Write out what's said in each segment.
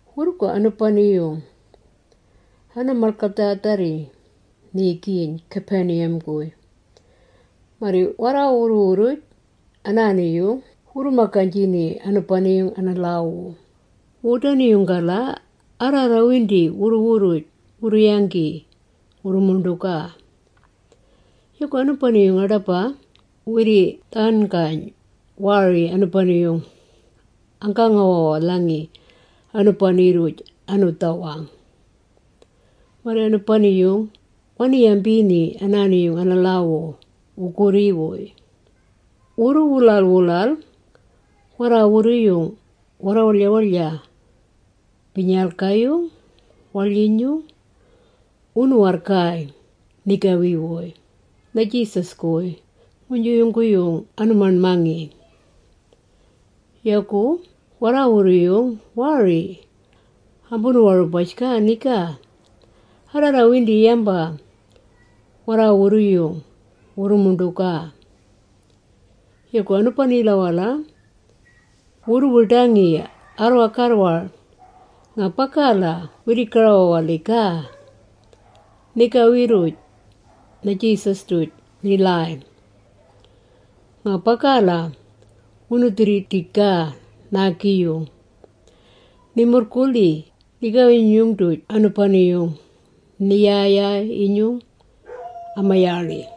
Wurrugu anubani-yung ana-malgadhaadharri niigiyn Capernaum-guy. Marri warra-wurru-wurruj anaani-yung wurru-magaynjini anubani-yung ana-lhaawu. Wudani-yung-gala, arraarrawindi wurru-wurruj wurru-yanggi wurru-muṉḏugaa. Yagu anubani-yung aḏaba wirri-dhaṉgayn, waari anubagu anggaawawalhangi anubani-rruj anu-dhawang. Marri anubani-yung wani-yambini anaani-yung ana-lhaawu wugurri-wuy. Wurru-wulal-wulal warraawurru-yung warra-waḻya-waḻya, bilnyalga-yung waḻyinyung wunu-warrgaay nigawi-wuy na-Jesus-guy, nguynju yungguyung anu-maṉmangi. Yagu warraawurru-yung waari ambunu-warubaj-gaa niga, arraarrawindi yamba warraawurru-yung wurru-muṉḏugaa. Yagu anubanila-wala, wurru-wiḏangi arrwa-garrwar nga bagala wirri-gara-wawalhijgaa nigawi-rruj na-Jesus-duj ni-lhaay. Nga bagala wunu-dhirridijgaa naagi-yung. Ni-murrgulhi nigawi-nyinyung-duj anubani-yung ni-ya-yaay-inyung ama-yaaḻi.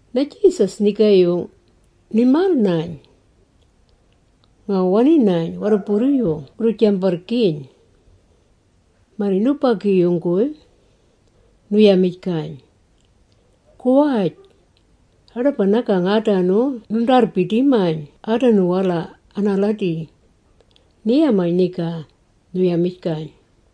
Na-Jesus nigaayung ni-mal-nayn nga wani-nayn warruburru-yung wurru-jambarrgiiyn. Marri nubagi-yung-guy nu-yamijgayn, “Guwaj, aḏaba nagang aadanu nundaarrbidi-mayn aadanu-wala anaaladi,” ni-yamayn niga, nu-yamijgayn.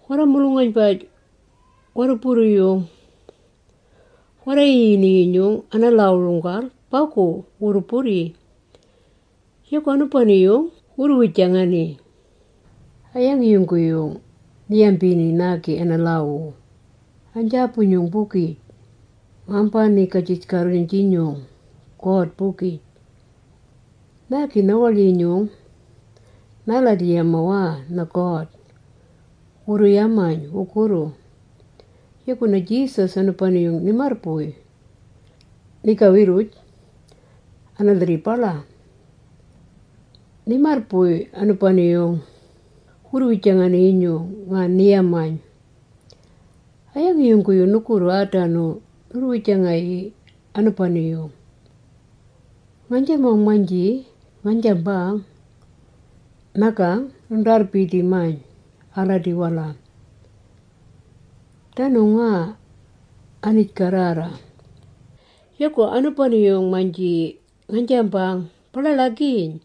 Warra-mulung-aynbaj warruburru-yung warra-yiyini-yinyung ana-lhaawu-runggal, bagu wurru-burri, yagu anubani-yung wurru-wijangani, “A-yangi yungguyung ni-yambini naagi ana-lhaawu? Aynjaabu-nyung-bugij ngambaniigajij-garruyn-jinyung, God-bugij. Naagi na-waḻyinyung naaladi-yamawana na-God!” wurru-yamayn wugurru. Yagu na-Jesus anubani-yung ni-marrbuy, nigawi-rruj ana-lhirribala. Ni-marrbuy anubani-yung wurru-wijangani-yinyung. Nga ni-yamayn, “A-yangi yungguyung nugurru aadanu nurru-wijangayii anubani-yung? Ngaynjamang-maynji ngaynjambang, ‘Nagang nundaarrbidi-mayn anaaladi-wala,’ danu nga aniij-garrarra. Yagu anubani-yung-maynji ngaynjambang ‘Ba-ḻaḻagiiyn,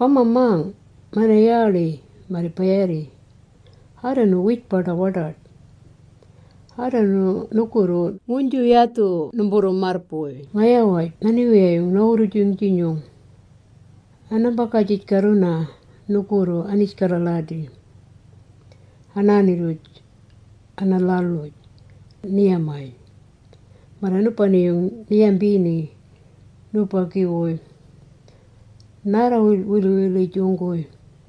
bamba-mang mana-yaaḻi marri ba-yaarri,’ aadanu wiij-baḏa-waḏaḏ. Aadanu nugurru numburru-marrbuy ngaya-waj na-Niwiyayung na-Wurrujung-jinyung, anambaagajij-garruna nugurru aniij-galadi, anaani-rruj ana-lhal-uj,” ni-yamayn, marri anubani-yung ni-yambini nubagi-wuy naarra-wilwilwilujung-guy,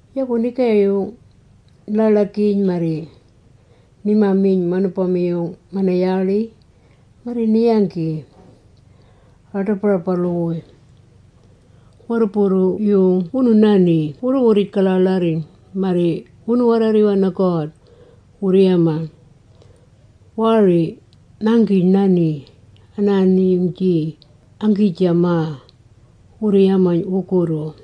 Yagu nigaayung ni-ḻaḻagiiyn marri nima-miyn manubama-yung mana-yaaḻi marri ni-yanggi aa-ḏabarabalu-wuy. Warruburru-yung wunu-nani wurru-wurrij-gaḻaaḻarriyn. Marri wunu-warraarriwaa na-God. Wurru-yamaa, “Waari ngaanggiij-nani, anaani-yung-jii anggiijamaa,” wurru-yamayn wugurru.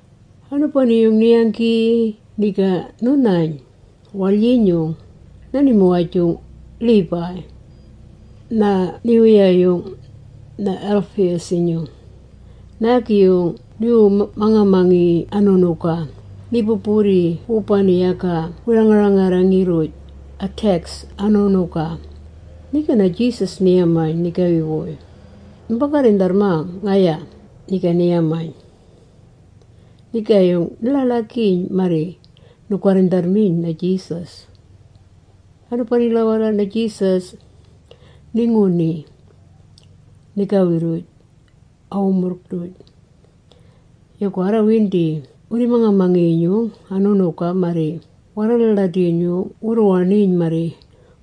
Anubani-yung ni-yanggi, niga nu-nayn waḻyinyung na-nimuwaj-jung Levi, na-niwiyayung na-Alphaeus. Naagi-yung niwu-mang-mangi-yinyung anu-ṉuga, ni-bu-burri wubani yaga wirriirrarrangi-rruj, a-tax anu-ṉuga. Niga na-Jesus ni-yamayn nigawi-wuy. “Numba-garrindharrmang ngaya,” ni-yamayn. Nigaayung ni-ḻaḻagiiyn marri nu-garrindharrmiyn na-Jesus. Anubanila-wala, na-Jesus ni-nguni nigawi-rruj a-wumurrng-duj. Yagu arrawindi wirri-manga-mangi-yinyung anu-ṉuga marri warraalaaladi-yinyung wurru-waṉiyn marri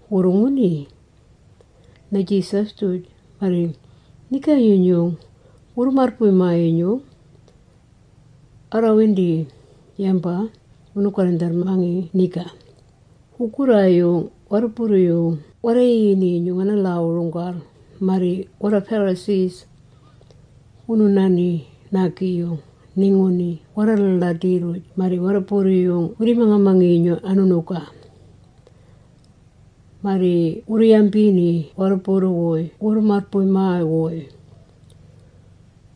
wurru-nguni na-Jesus-duj marri nigawi-nyinyung wurru-marrbuy-maa-yinyung, arraarrawindi yamba wunu-garrindharrmani niga. Wugurraayung warruburru-yung warra-yiyini-yinyung ana-lhaawu-runggal marri warra-Pharisee wunu-nani naagi-yung ni-nguni warraalaaladi-rruj marri warruburru-yung wirri-manga-mangi-yinyung anu-ṉuga. Marri wurru-yambini warruburru-wuy wurru-marrbuy-maa-wuy.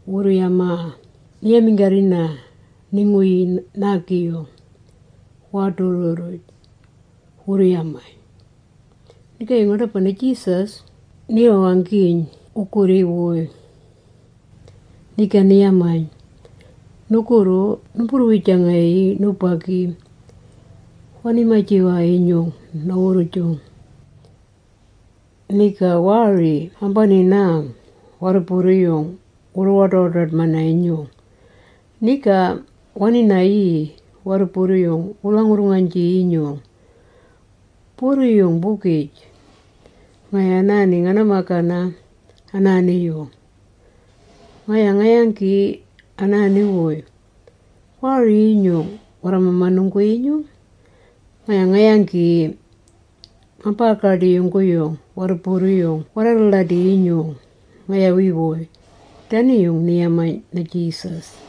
Wurru-yamaa, “Ni-yaminggarrina, ni-nguni naagi-yung waadurru-rruj?” wurru-yamayn. Nigaayung aḏaba na-Jesus ni-wawanggiyn wugurri-wuy, niga ni-yamayn, “Nugurru numburru-wijangayii nubagi wani-maji-wana-yinyung na-wurrujung. Niga waari ambani-nang warruburru-yung wurru-waḏa-waḏaḏ-mi-yinyung. Niga wani-nayii warruburru-yung wuu-lhangurrnganjii-yinyung, burru-yung-bugij. Ngaya anaani ngana-magana anaani-yung. Ngaya nga-yanggi anaanu-wuy, waari-yinyung warra-mamanunggu-yinyung. Ngaya nga-yanggi, ngambaa-gaḏii yungguyung warruburru-yung warraalaaladi-yinyung ngayawi-wuy.” Dani-yung ni-yamayn na-Jesus.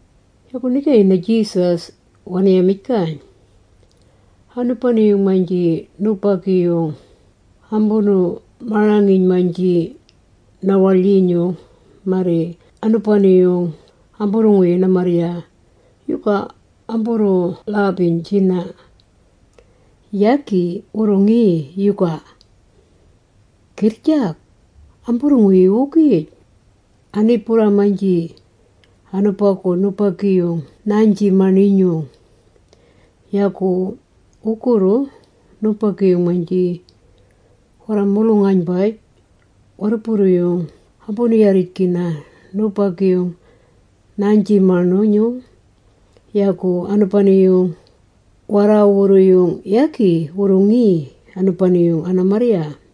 Yagu nigaayung na-Jesus wani-yamijgayn, “Anubani-yung-maynji nubagi-yung ambunu-marangiiyn-maynji na-waḻyinyung, marri anubani-yung amburru-nguyii ana-marrya, yuga amburru-lhambiynjina, yagi wurru-ngi yuga? Girrjag! Amburru-nguyii-wugij, ani-burraa-maynji anubagu nubagi-yung naaynji-maṉinyung. Yagu wurrugu, nubagi-yung-maynji warra-mulung-aynbaj warruburru-yung ambunu-yarrijgina nubagi-yung naaynji-maṉinyung, yagu anubani-yung warraawurru-yung yagi wurru-ngi anubani-yung ana-marrya.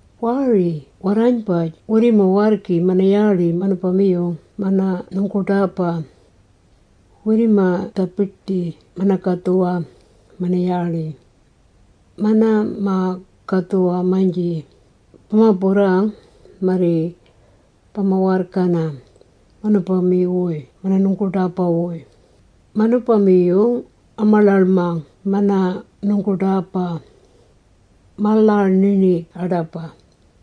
“Waari warraaynbaj wirrima-warrgi mana-yaaḻi manubama-yung mana-nungguḏaaba, wirrima-dhabiḏbi mana-magadhuwa mana-yaaḻi. Mana-ma-gadhuwa-maynji bama-burrang, marri bama-warrgana, manubama-wuy mana-nungguḏaaba-wuy, manubama-yung ama-ḻaḻmang mana-nungguḏaaba, ma-lhar-ninig aḏaba.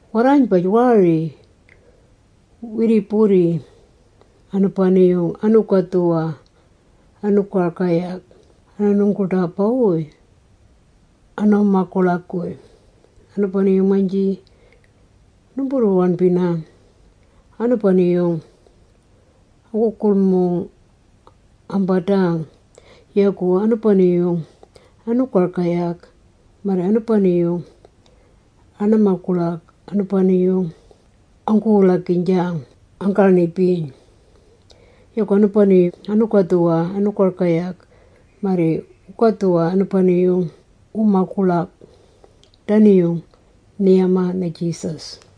Warraaynbaj waari wirri-burri anubani-yung anu-gadhuwa anu-gargayag ana-nungguḏaaba-wuy anu-maguḻag-guy. Anubani-yung-maynji numburru-waṉbina, anubani-yung anggu-gulmung-ambadang yagu anubani anu-gargayag marri anubani ana-maguḻag anubani-yung anggu-wulagiynjang anggaaṉibiyn. Yagu anubani anu-gadhuwa anu-gargayag marri wugadhuwa anubani-yung wumaguḻag.” Dani-yung ni-yamaa na-Jesus.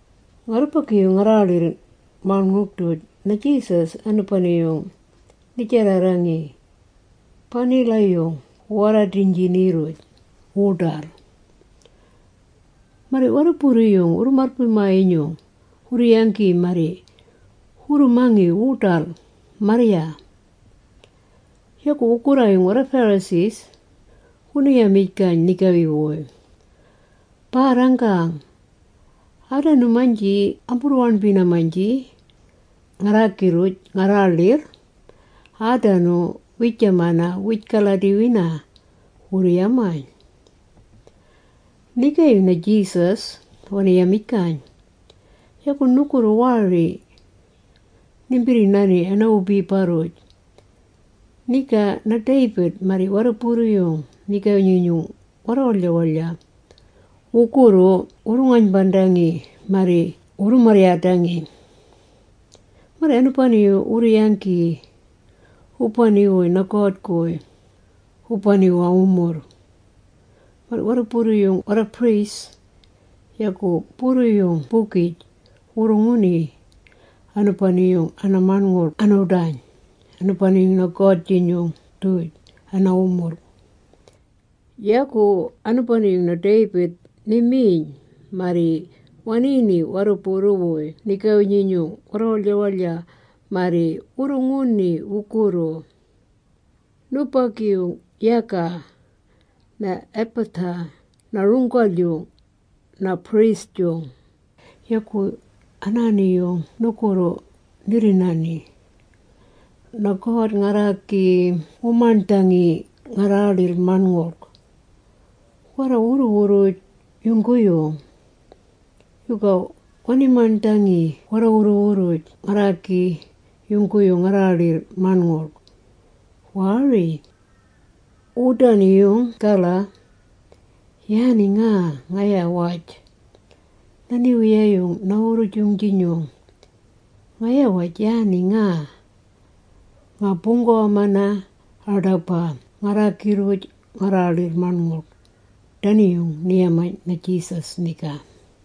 Ngarrubagi-yung ngarraaḻirr-maṉngulg-duj, na-Jesus anubani-yung ni-jarrarrangi banila-yung wu-warradiynjini-rruj wuḏal. Marri warruburru-yung wurru-marrbuy-maa-yinyung wurru-yanggi marri wurru-mangi wuḏal marrya. Yagu wugurraayung warra-Pharisee wunu-yamijgayn nigawi-wuy, “Baarranggang, aadanu-maynji amburru-waṉbina-maynji ngarraagi-rruj ngarraaḻirr, aadanu wiijamana wiij-galadi-wina,” wurru-yamayn. Nigaayung na-Jesus wani-yamijgayn, “Yuga nugurru waari nimbirri-nani ana-wubiba-rruj, niga na-David marri warruburru-yung nigawi-nyinyung warra-waḻya-waḻya wugurru wurru-ngaynbandangi marri wurru-marryaadangi. Marri anubani-yung wurru-yanggi wubani-wuy na-God-guy wubani-wuy a-wumurrng. Marri warruburru-yung warra-priest, yagu burru-yung-bugij wurru-nguni anubani-yung ana-maṉngulg anu-ḏayn anubani-yung na-God-jinyung-duj ana-wumurrng. Yagu anubani-yung na-David ni-miyn, marri waniini warruburru-wuy nigawi-nyinyung warra-waḻya-waḻya, marri wurru-nguni wugurru. Nubagi-yung yaga na-Abiathar na-runggal-yung na-priest-jung. Yuga anaani-yung nugurru nirri-nani? Na-God ngarraagi ngu-maṉdhangi ngarraaḻirr-maṉngulg, warra-wurru-wurruj yungguyung. Yuga wani-maṉdhangi warra-wurru-wurruj ngarraagi yungguyung ngarraaḻirr-maṉngulg? Waari! Wudani-yung-gala, yaani nga ngaya-waj na-Niwiyayung na-Wurrujung-jinyung, ngaya-waj yaani nga nga-buunggawa-mana aḏaba ngarraagi-rruj ngarraaḻirr-maṉngulg.” Dani-yung ni-yamayn na-Jesus niga.